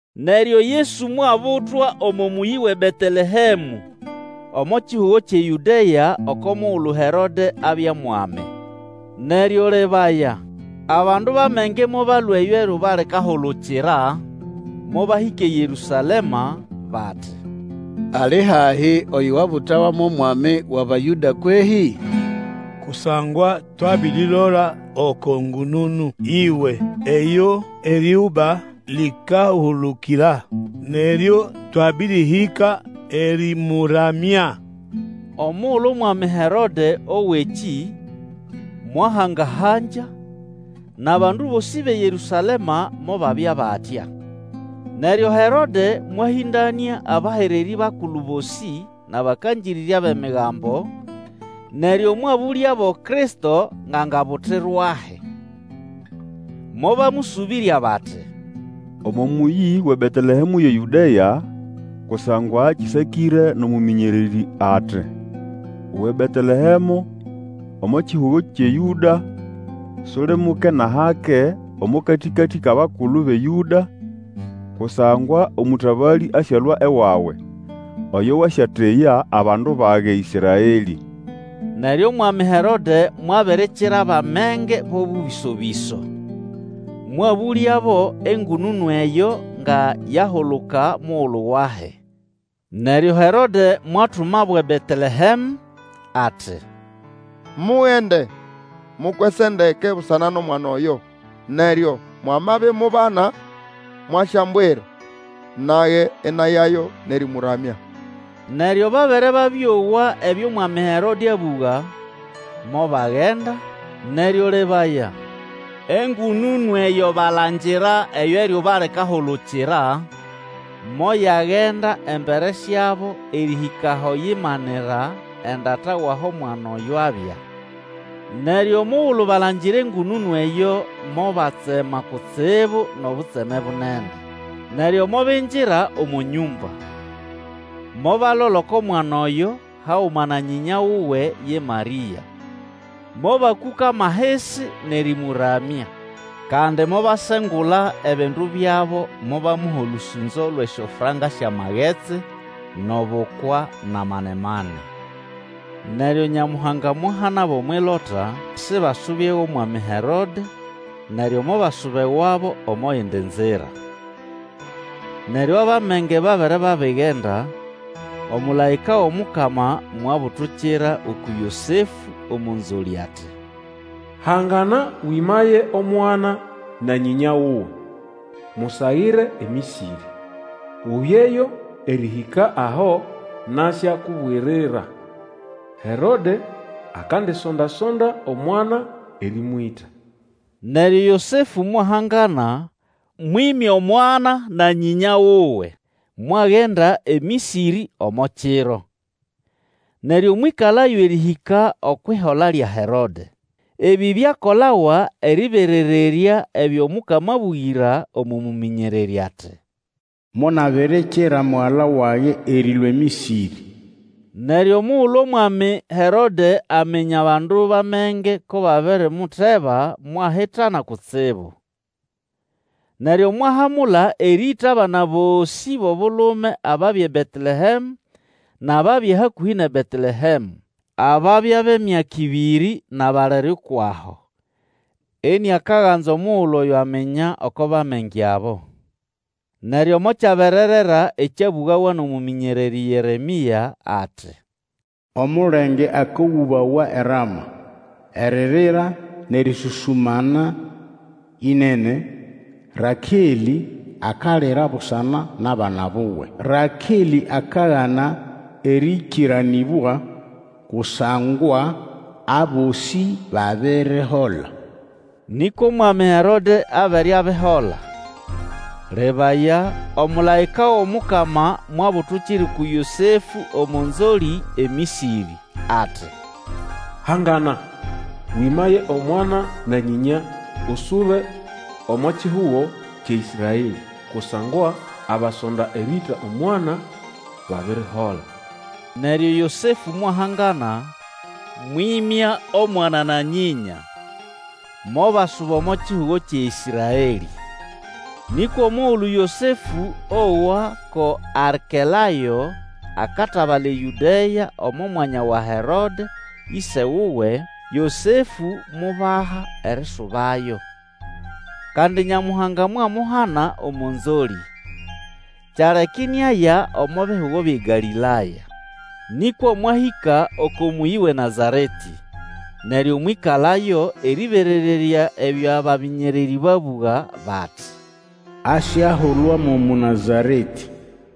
Neryo Yesu mwabutwa omo mũyĩ wʼeBetelehemũ, omo kihugo kyʼeYũdea oko mugulu Herode abya mwami. Neryo lebaya, abandu bʼamenge mobalũa eyo eryuba likahulukira, mobahĩka eYerũsalema, bati, Ali hahi oyo wabutawa mo mwami wʼAbayũda kwehĩ? Kusangwa twabirilola oko ngũnũnũ yiwe eyo eryuba likahulukira, neryo twabĩrĩhĩka erĩmũramya. Omugulu omwami Herode owa ekĩ, mwahanga-hangya, nʼabandu bosĩ bʼeYerũsalema mobabya batya. Neryo Herode mwahĩndanĩa abahererĩ bakulu bosĩ nʼabakangĩrĩrya bʼemigambo, neryo mwabũlyabo Kristo ngʼangabutirwahi. Mobamũsũbĩrya bati, Omo mũyĩ wʼeBetelehemũ yʼeYũdea, kusangwa kĩsakĩre nʼomũmĩnyererĩ ati, Uwe Betelehemũ omo kihugo kyʼe Yũda, Suli muke nʼahake omo katĩkatĩ kʼabakulu bʼeYũda; Kusangwa omũtabalĩ asyalũa ewawe, Oyo wasyateya abandu bage Ĩsraelĩ. Neryo omwami Herode mwabirikira abʼamenge bo bũbĩso-bĩso, mwabũlyabo engũnũnũ eyo nga yahuluka mugulu wahi. Neryo Herode mwatumabo eBetelehemũ, ati, Mugende mukwese ndeke busana nʼomwana oyo; neryo mwamabimubana mwasyambwira, nage inayayo nʼerĩmũramya. Neryo babere babĩowa ebyo mwami Herode abũga, mobagenda, neryo lebaya engũnũnũ eyo balangira eyo eryuba likahulukira, moyagenda embere syabo erĩhĩka aho yahangana endata wʼaho mwana oyo abya. Neryo omugulu balangira engũnũnũ eyo mobatsema kutsibu nʼobutseme bunene. Neryo mobingira omo nyũmba, mobalola oko mwana oyo haguma na nyĩnya wuwe ye Marĩa. Mobakũkama ahisi nʼerĩmũramya; kandi mobasengula ebindu byabo mobamuha olũsũnzo lwʼesyofranka syʼamagetsi, nʼobukwa nʼamanemane. Neryo Nyamuhanga mwahanabo omwʼilota sibasube ewʼomwami Herode; neryo mobasuba ewabo omo yindi nzira. Neryo, abʼamenge babere babigenda, omũlaĩka wʼomukama mwabutukira uku Yosefũ omo nzolĩ ati, Hangana, wĩmaye omwana na nyĩnya wuwe, musagire eMĩsĩrĩ, ubyeyo erĩhĩka aho nasyakubwirira. Herode akandisonda-sonda omwana erĩmwĩta. Neryo Yosefũ mwahangana, mwĩmya omwana na nyĩnya wuwe, mwagenda eMĩsĩrĩ omo kiro. Neryo mwĩkalayo erĩhĩka okwʼihola lya Herode. Ebĩ byakolawa erĩberererya ebyo Mukama abũgĩra omo mũmĩnyererĩ ati, Monabirikira Mugala wage erĩlũa eMĩsĩrĩ. Neryo omugulu omwami Herode aminya abandu bʼamenge ko babirimuteba mwahitana kutsibu. Neryo mwahamula erĩĩta abana bosĩ bʼobulume ababya eBetelehemũ nʼababya hakũhĩ nʼeBetelehemũ, ababya bʼemyaka ĩbĩrĩ nʼabalere kwʼaho, iniakaganza omugulu aminya oko bʼamenge abo. Neryo mokyabererera ekyabũgawa nʼomũmĩnyererĩ Yeremĩa ati, Omulenge akogũbawa eRama, Eririra nʼerĩsũsũmana ĩnene, Rakelĩ akalira busana nʼabana buwe, Rakelĩ akagana erĩkĩranĩbwa, Kusangwa abosĩ babirihola. Nĩkwa omwami Herode abere abihola, lebaya, omũlaĩka wʼomukama mwabutukira uku Yosefũ omo nzolĩ eMĩsĩrĩ, ati, Hangana, wĩmaye omwana na nyĩnya, usube omo kihugo kyʼeĨsraelĩ, kusangwa abasonda erĩĩta omwana babirihola. Neryo Yosefũ mwahangana, mwĩmya omwana na nyĩnya, mobasuba omo kihugo kyʼeĨsraelĩ. Nĩkwa omugulu Yosefũ owa ko Arkelayo akatabala eYũdea omo mwanya wa Herode ĩse wuwe, Yosefũ mubaha erisubayo. Kandi Nyamuhanga mwamuhana omo nzolĩ, kyaleka iniaya omo bihugo byʼeGalĩlaya. Nĩkwa mwahĩka oko mũyĩ wʼeNazaretĩ neryo mwĩkalayo, erĩberererya ebyo bamĩnyererĩ babũga bati, Asyahulwa mo Mũnazaretĩ.